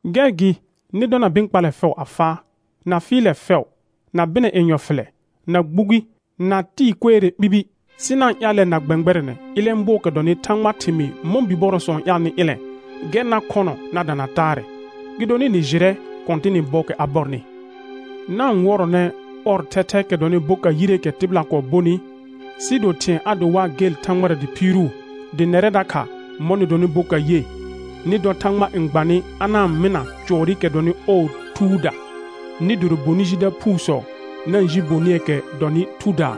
Gɛr gɩ nɩ dɔna bɩ̃ kpallɛ fɛʋ a faa, na fɩɩlɛ fɛʋ, na bɩnɛ yenyɔ fɩlɛ, na gbugi, na tɩɩ kuere ɓibi; sɩ na-n ƴaalɛ na gbɛ̃gbɛrɛnɛ ilẽ bʋɔɔkɛ dɔnɩ Thãgbaa thɩmɩɩ mɔ̃ bibɔrɔsɔ n ƴaalnɩ ɩlɛ̃, gɛr na khɔnɔ na dana taarɛ, gɩdonɩ «nɩ jɩrɛ Kɔ̃tɩnɩ bɔɔkɛ a bɔrnɩ.» Na-n wɔrɔnɛ ɔr thɛthɛɛkɛ dɔnɩ boka yireekɛ tɩbɩla kɔɔ bonɩ, sɩɩ do thɩ̃ɛ a do waa gel Thãgbara dɩ phiiruu. Dɩ nɛrɛ dakha mɔ̃ nɩ donɩ boka ye, nɩ dɔ Thãgba n gba nɩ a na-n mɩna cʋɔrɩkɛ dɔnɩ ɔɔ Thuuda, nɩ doro bonɩ jida phuusɔ na-n ji bonɩɛɛkɛ dɔnɩ Thudaa,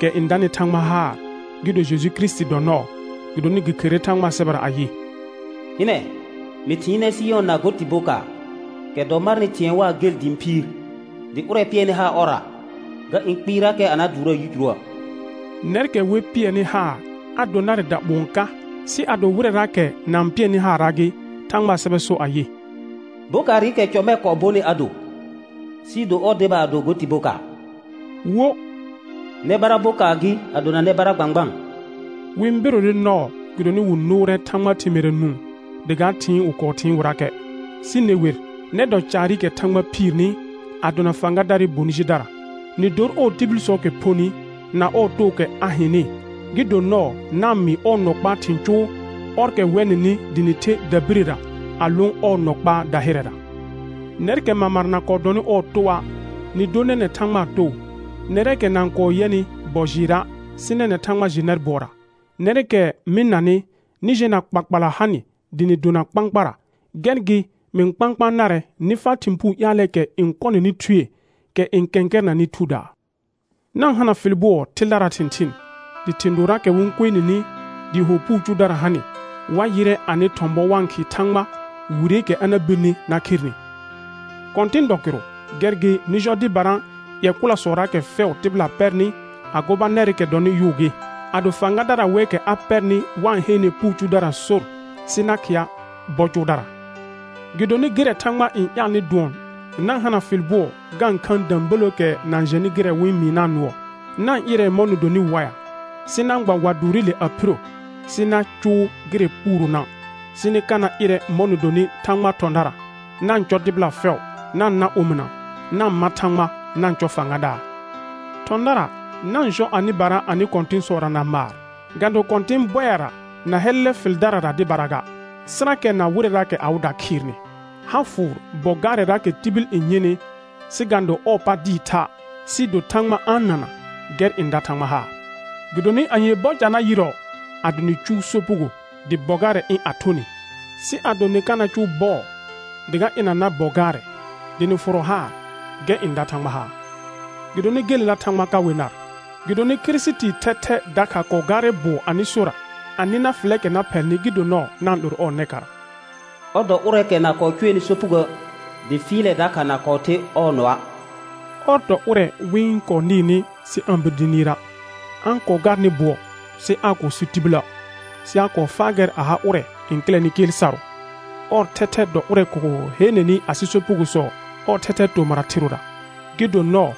kɛ n danɩ Thãgba haar, gɩ do Jeju Kirisiti dɔ nɔɔ. Gɩdonɩ gɩ kherere Thãgbaa sɛbɛra ayɩ: «Hɩnɛ, mɩ thɩɩnɛ Sɩyɔna go tɩ bokaar, kɛ dɔ marnɩ thɩ̃ɛ waa gel dɩ ɩ̃ phiir. Dɩ ʋrɛ pɩɛrnɩ haar ɔrra, ga ɩ̃ kpɩɩrakɛ a na dʋʋraa yicuruə'.» Nɛrkɛ wer pɩɛrnɩ haar, a do narɛ daɓʋ̃ɔ ka, sɩ ado wɩrɛraakɛ na-n pɩɛrnɩ haara gɩ, Thãgbaa sɛbɛ sor ayɩ: «Bokaarɩkɛ cɔ mɛ kɔɔ bonɩ a do, sɩɩ do ɔr deba a do go tɩ bokaar.» Wo: «Nɛ bara bokaar gɩ a dona nɛ bara gbãgbaan.» Wɩ-n berore nɔɔ gɩdonɩ wɩ nʋʋrɛ Thãgbaa thɩmɩɩra nũu dɩ ga thɩɩn wɩ kɔɔ thɩɩn wɩrakɛ. Sɩ ne wer, nɛr dɔ caarɩkɛ Thãgba phiirni, a dona Fãgadaarɩ bonɩ jidara, nɩ dor ɔɔ tibilsɔɔkɛ phonɩ, na ɔɔ tookɛ a hɩnɩ, gɩ do nɔɔ na-n mɩɩ ɔɔ nɔ kpaa thɩ̃ cʋʋ, ɔrkɛ wɛ nɩnɩ dɩ nɩ the dabirəra a lõ ɔɔ nɔ kpaa dahɩrɛra. Nɛrkɛ mamara na kɔɔ dɔnɩ ɔɔ toa', nɩ dor nɛnɛ̃ Thãgbaa too; nɛrɛɛkɛ na-n kɔɔ yɛnɩ bɔ jɩɩra', sɩ nɛnɛ̃ Thãgba jɩ nɛr bʋɔra. Nɛrkɛ mɩ-n nanɩ, nɩ jɛna kpakpala ha nɩ dɩ nɩ dona kpãkpara, gɛr gɩ mɩ-n kpãkpãa narɛ nɩ faa thɩ̃ puu ƴaalɛɛkɛ n kɔ nɩnɩ thue, kɛ n kɛ̃kɛrɛnanɩ thudaa. Na-n hana fɩl bʋɔ thɩldaraa thɩ̃thɩɩn, dɩ thɩ̃ dooraakɛ wɩ-n kue nini dɩɩ ho puu cʋʋdara ha nɩ, wa ƴɩrɛ anɩ thɔ̃ bɔ wa-n khɩɩ Thãgba wireekɛ a na birni na kher nɩ. Kɔ̃tɩn dɔ kɩrʋ, gɛr gɩ nɩ jɔ dɩbara ƴɛ kʋlasɔraakɛ fɛʋ tɩbɩla pɛrnɩ, a gobanɛrɩkɛ dɔnɩ yʋʋ gɩ, ado fãgadara wɛɛkɛ a pɛrnɩ wa-n heene puu cʋʋdara sor sɩ na khɩa bɔ cʋʋdara; gɩdonɩ gɩrɛ Thãgba n ƴaalnɩ dʋɔn na-n hana fɩl bʋɔ ga-n khaan dəbələəkɛ na-n jɛnɩ gɩrɛ wɩ-n mɩɩna' nʋɔ. Na-n ɩrɛ mɔ̃ nɩ donɩ waɩa, sɩ na-n gba wa dʋʋrɩle a phiro sɩ na cʋʋ gɩrɛ puuronə', sɩ nɩ ka na ɩrɛ mɔ̃ nɩ donɩ Thãgbaa thɔ̃dara. Na-n cɔ tɩbɩla fɛʋ; na-n na omɩna; na-n ma Thãgba; na-n cɔ fãgadaar. Thɔ̃dara na-n jɔ anɩbara anɩ kɔ̃tɩ̃sɔra na maar, ga do kɔ̃tɩ̃ bɔɩra na hɛlɛlɛ fɩldarara dɩbara ga, sɩrakɛ na wɩrɛraakɛ awɩda khɩɩrnɩ. Ha fʋʋr bɔ gaarɛraakɛ tibil n yɩnɩ sɩ ga-n do ɔɔ pa dɩɩ tha', sɩɩ do Thãgba a-n nana, gɛr n da Thãgba haar. Gɩdonɩ anyee bɔ ca na yɩrɔ ado nɩ cʋʋ sopugo dɩ bɔ gaarɛ ɩ̃ a thʋ nɩ? Sɩ ado nɩ ka na cʋʋ bɔɔ dɩ ga ɩna nar bɔ gaarɛ dɩ nɩ fʋrɔ haar, gɛr n da Thãgba haar. Gɩdonɩ gelela Thãgba ka we nar, gɩdonɩ Kirisitii thɛthɛ dakha kɔɔ gaarɛ bʋɔ anɩ sora a nɩ nar fɩlɛɛkɛ na phɛlnɩ gɩ do nɔɔ na-n 'loro ɔɔ nɛkara. Ɔr dɔ ʋrɛɛkɛ na kɔɔ cʋɛnɩ sopugoə', dɩ fɩɩlɛ dakha na kɔɔ the ɔɔ nɔa'. Ɔr dɔ ʋrɛ wɩ-n kɔɔ nɩɩrnɩ sɩ aa-n bir dɩ nɩɩra', a-n kɔɔ gaarnɩ bʋɔ sɩ aa kɔɔ so tibilə', sɩ a kɔɔ faa gɛr a ha ʋrɛ n kɩlɛnɩ kɩɩl sarʋ. Ɔr thɛthɛ dɔ ʋrɛ kɔɔ heenenɩ asɩ sopugosɔ ɔɔ thɛthɛɛ tomɩra thɩrʋra, gɩ do nɔɔ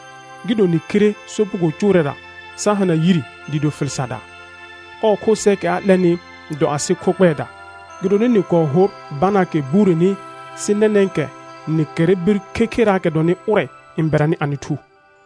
gɩ do nɩ khire sopugo cʋʋrɛra sa hana yire dɩɩ do fɩl sardaa. Ɔɔ kho sɛɛkɛ a 'lɛnɩ dɔ asɩ kho kpɛɛda. Gɩdonɩ nɩ kɔɔ hor banaakɛ bureni, sɩ nɛnɛ̃kɛ nɩ kɛrrɛ bir khekheraakɛ dɔnɩ ʋrɛ n bɛranɩ anɩ thu.